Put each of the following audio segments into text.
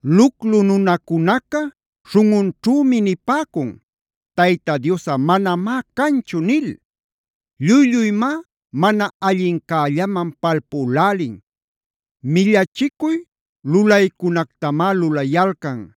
Luclu nunacunaca śhunꞌunćhümi nipäcun: “Tayta Diosꞌa manamá canchu” nil. Lluy-lluymá mana allincällaman palpülälin, millachicuy lulaycunactamá lulayalcan.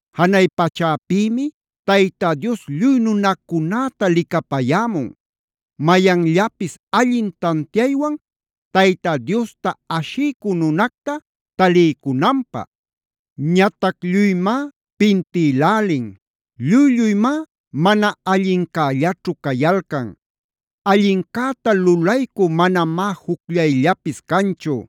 Janay pachäpïmi Tayta Dios lluy nunacunäta licapayämun. Mayanllapis allin tantiaywan Tayta Diosta ashiycü nunacta taliycunanpä. Ñatac lluymá pintïlälin. Lluy-lluymá mana allincällaćhu cayalcan. Allincäta lulaycü manamá jucllayllapis canchu.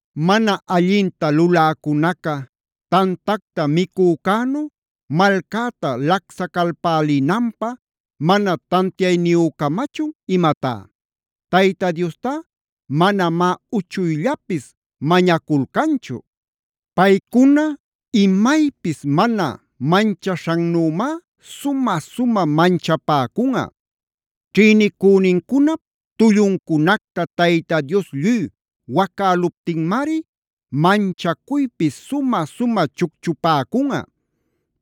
¿Mana allinta luläcunaca tantacta micücänu malcäta lacsacalpälinanpä mana tantiayniyücamachun imatá? Tayta Diostá manamá uchuyllapis mañaculcanchu. Paycuna imaypis mana manchaśhannümá sumä-sumä manchapäcunꞌa. Ćhïnicünincunap tulluncunacta Tayta Dios lluy wacäluptinmari manchacuypi sumä-sumä chucchupäcunꞌa.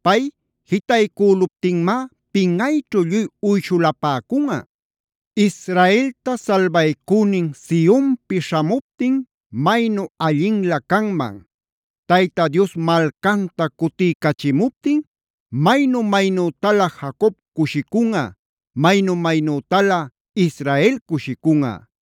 Pay jitaycüluptinmá pinꞌayćhu lluy uyshulapäcunꞌa. ¡Israelta salbaycünin Sionpi śhamuptin maynu allinlä canman! Tayta Dios malcanta cutiycachimuptin maynu-maynütalä Jacob cushicunꞌa, maynu-maynütalä Israel cushicunꞌa.